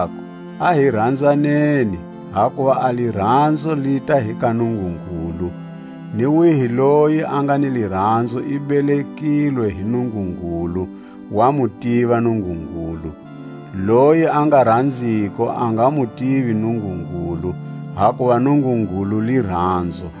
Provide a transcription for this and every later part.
Varanzekako, a hi ranzaneni, hakuva a liranzo lita hi ka Nungungulu; ni wihi loyi a nga ni liranzo i belekilwe hi Nungungulu, wa mu tiva Nungungulu. Loyi a nga ranziko a nga mu tivi Nungungulu, hakuva Nungungulu liranzo.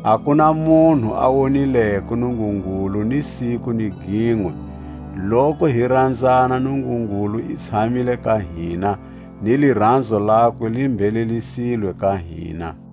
A ku na munhu a wonileko Nungungulu ni siku ni ginwe. Loku hi ranzana, Nungungulu i tshamile ka hina, ni liranzo lakwe li mbhelelisilwe ka hina.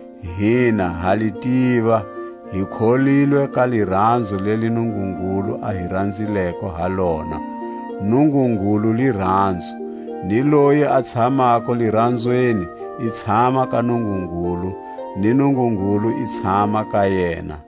Hina ha li tiva, hi kholilwe ka liranzo leli Nungungulu a hi ranzileko ha lona. Nungungulu liranzo, ni loyi a tshamako liranzweni i tshama ka Nungungulu, ni Nungungulu i tshama ka yena.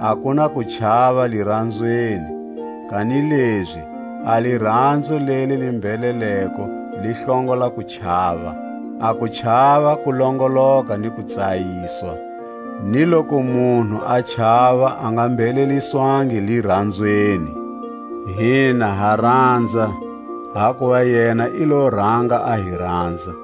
A ku na kuchava liranzweni, kanilezi a liranzo leli li mbheleleko li hlongola kuchava. A kuchava ku longoloka ni kutsayiswa, ni loku munhu a chava a nga mbheleliswangi liranzweni. Hina ha ranza, hakuva yena i lo ranga a hi ranza.